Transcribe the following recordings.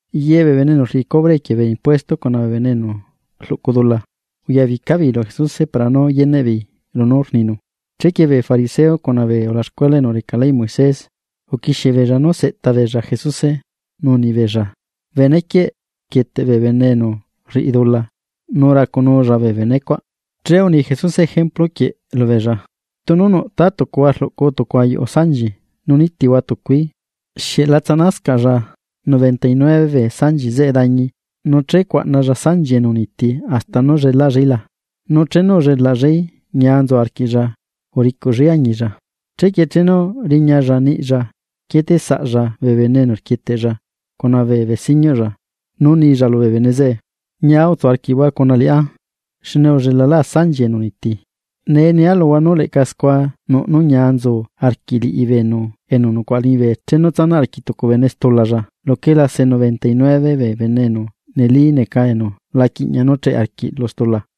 Ye bee bene enu rriꞌi cubre equie bee impuesto cuna bee bene enu rluꞌcu dula, uyabica beei lu Jesuse para nú yeneꞌ beei lunú rninu. Chequie bee fariseo cuna bee ulaxcuela enu reca leyꞌ Moisés, uquixie beei nú seꞌta beei Jesuse nú unibeei: ―Benequieꞌ rquieteꞌ bee bene enu rriꞌi dula nu racunulla bee benecuaꞌ. Che uni Jesuse ejemplu quieꞌ lubeei: ―Tunu nuꞌ tátucuhua rluꞌcu tucu ayuꞌu sanchi nu nitihua tucui, ¿xieꞌ la tsaꞌnascaꞌlla noventa y nueve bee sanchi zeꞌe dañi nu che cuaꞌnalla sanchi enu uniiti hasta nú llelaꞌllaí la? Nu chenu ullelaꞌllaí, ñia nzu arquiꞌlla uricuꞌllaí añilla. Chequie chenu riñalla niꞌlla quieteꞌsaꞌlla bee bene enu rquieteꞌlla cuna bee besiñuꞌlla, nu nilla lubee bene zeꞌe: “Ñia utsu arquiꞌhua cuna liꞌá, xne ullelalá sanchia enu uniti.” Nee nia luhua, nú leꞌca scua nuꞌ nú ñia nzu arquiꞌ liꞌi beenu enu nucuaꞌa liñibe chenu tsanaꞌ arquiꞌ tucu bene stulalla luquela se noventa y nueve bee bene enu neli neca enu la quiꞌña nú cheꞌe arquiꞌ lu stula.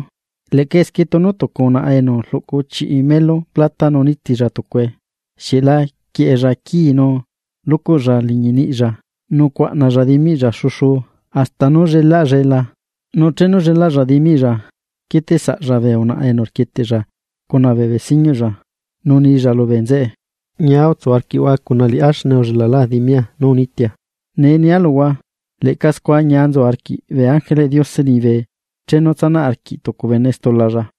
’Leꞌca esquie tunu tucu unaꞌa enu rluꞌcu chiꞌi melu plata nu nitilla tucue, ¿xieꞌ la quieꞌella quii nu lucuꞌlla liñi niꞌlla nu cuaꞌnalla dimiꞌlla xuxuu hasta nú llelaꞌllae la? Nu chenu llelaꞌlla dimiꞌlla, quieteꞌsaꞌlla bee unaꞌa enu rquieteꞌlla cuna bee besiñuꞌlla, nu nilla lubee nzeꞌe: “Ñia utsu arquiꞌhua cuna liꞌá xne ullelalá dimia nú unitia.” Nee nia luhua, leꞌca scua ñia nzu arquiꞌ bee ángeleꞌ Diose liñibe chenu tsanaꞌ arquiꞌ tucu bene stulalla.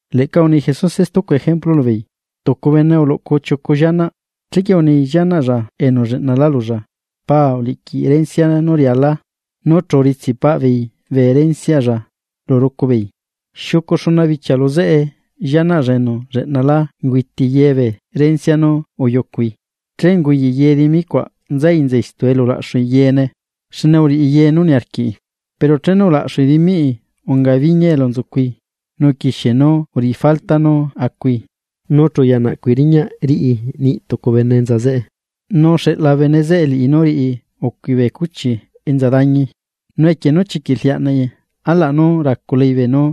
Leꞌca uni Jesuse stucu ejemplu lubeei: ―Tucu bene uluꞌcu chiucu llianaꞌ, chequie uni llianaꞌlla enu lleꞌnalá lulla: “Paa uliꞌquiꞌ rencia nú rialaa.” Nu chu uritsiꞌ paꞌ beei bee renciaꞌlla lu rucu beei. Xiucu xuna bichia lu zeꞌe llianaꞌlla enu lleꞌnalá ungüiti ye bee rencia nú uyucui. Che unguyaꞌi dimi cuaꞌ nzai enza istu elu ulaꞌxui yeene, xne uriꞌi ye nú niarquiꞌi. Pero chenu ulaxu dimiꞌi unga biñia elu nzucui, nu uquixie nú uriꞌi falta nú acui. Nu chu uya naꞌcui riñaꞌ riꞌi niꞌ tucu bene enza zeꞌe, nu uxeꞌla bene zeꞌe liꞌi nú riꞌi ucui bee cuchi enza dañi. Nu equie nú chiquiꞌ rliaꞌnaꞌi alaꞌ nú raculai beenú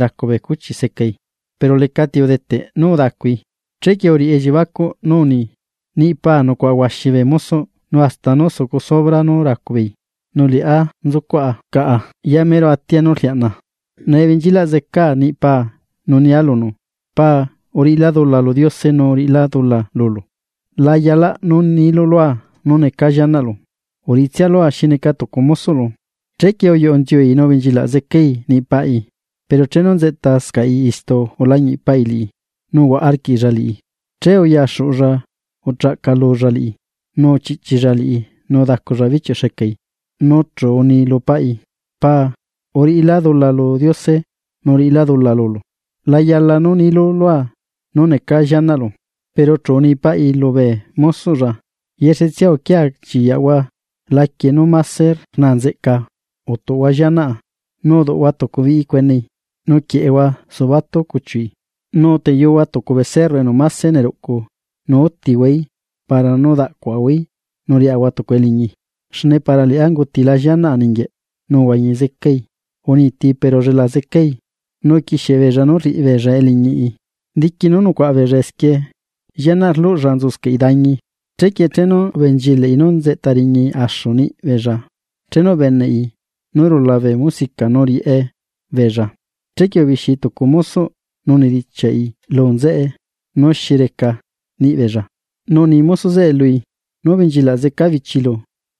racu bee cuchi nú secai, pero lecati udeteꞌ nú udacui. Chequie uriꞌi elliebacuꞌ nú uni: “¡Niꞌ paa nucuaꞌa huaxi bee mosoꞌ nu hasta nú sucu sobra nú racu beei, nu liꞌá nzucuaꞌa caꞌa ya mero atia nú rliaꞌnaa! Nee benchilaꞌ zecaa niꞌ paa nu nia lunu: Paa, uriꞌila dula lu Diose nu uriꞌila dula lulu, la yalaꞌ nú nilu lua nú neca llianaꞌlu. Uriꞌitsia lua xi neca tucu mosoꞌlu.” Chequie uyuꞌu nziui nu ubenchilaꞌ zecai niꞌ paꞌi. ’Pero chenu nzeꞌtascaꞌi istu ulañiꞌ paꞌi liꞌi, nu uhuaꞌa arquiꞌlla liꞌi. Che uyaxuꞌulla uchaꞌcalulla liꞌi, nu uchiꞌchilla liꞌi nu udaculla bichiuꞌ xecai. Nu chu uni lu paꞌi: “Paa uriꞌila dula lu Diose, nu uriꞌila dula lulu, la yalaꞌ nú nilu lua nú neca llianaꞌlu.” Pero chu uni paꞌi lubee mosoꞌlla: “Yexetsia uquia chiyaꞌhua laquie nú máse rnaa nzeꞌca utuꞌhua llianaꞌa, nu uduꞌhua tucu biꞌi cuenei nu quieꞌehua subatu cuchiuꞌi. Nu uteyuhua tucu becerro enu máse neruꞌcu nu útihuaí para nú daꞌcuaꞌahuaí, nu riꞌahua tucu eliñi. Xne para liꞌá ungutila llianaꞌa ninguieꞌ, nu uhuañi zecai. Uniiti, pero ullela zecai.” Nu uquiexie beella nú rriꞌi beella eliñiꞌi. ’Diqui nú nucuaꞌa beella esquie, llianaꞌ rluꞌlla nzuscaꞌi dañi. Chequie chenu ubenchilaꞌi nú nzeꞌta riñai axu niꞌbeella, chenu ubeneꞌi nú rula bee musica nu rieꞌe beella, Chequie ubixiai tucu mosoꞌ niꞌbeella nu unidichiaꞌi lu nzeꞌe nú xi reca niꞌ beella. Nu uni mosoꞌ zeꞌe lui: “Nú ubenchilaꞌ zeca bichilu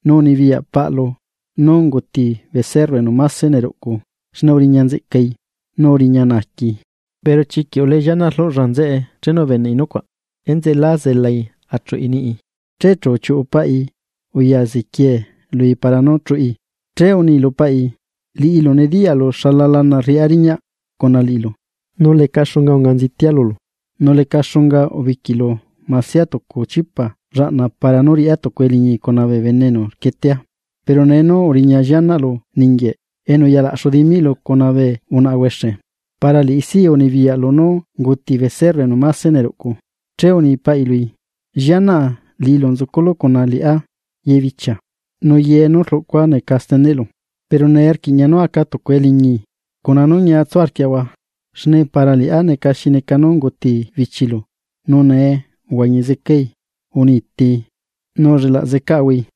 nu unibiyaꞌ paꞌlu nú unguti becerro enu máse neruꞌcu xne uriña nzeꞌcai nu uriña naaquii.” Pero chiquiꞌ ulee llianaꞌ rluꞌlla nzeꞌe nu la zelai chuꞌi niꞌi, che chu uchiuꞌu paꞌi uya ziquie lui para nú chuꞌi. Che uni lu paꞌi: “Liꞌilu nediyaꞌlu xala lana rriꞌá riñaꞌ cuna liꞌilu, nu leca xunga unga nzitia lulu, nu leca xunga ubiquiꞌlu masia tucu chipa llaꞌna para nú riꞌá tucu eliñi cuna bee enu rquietea. Pero nee nú uriña llianaꞌlu ninguieꞌ, enu uya laꞌxu dimiꞌlu cuna bee unaꞌa huexe. Para liꞌi sí unibiyaꞌlu nú unguti becerro enu máse neruꞌcu.” Che uni paꞌi lui: “Llianaꞌa liꞌilu nzuculu cuna liꞌá ye bichia, nu ye nú rlucua neca steneꞌlu. Pero nee rquiꞌña nú aca tucu eliñi cuna nú ñia tsu arquiaꞌahua, xne para liꞌá neca xi neca nú unguti bichilu nu nee uhuañi zecai, unitii, nu ullelaꞌ zecaꞌahuai.”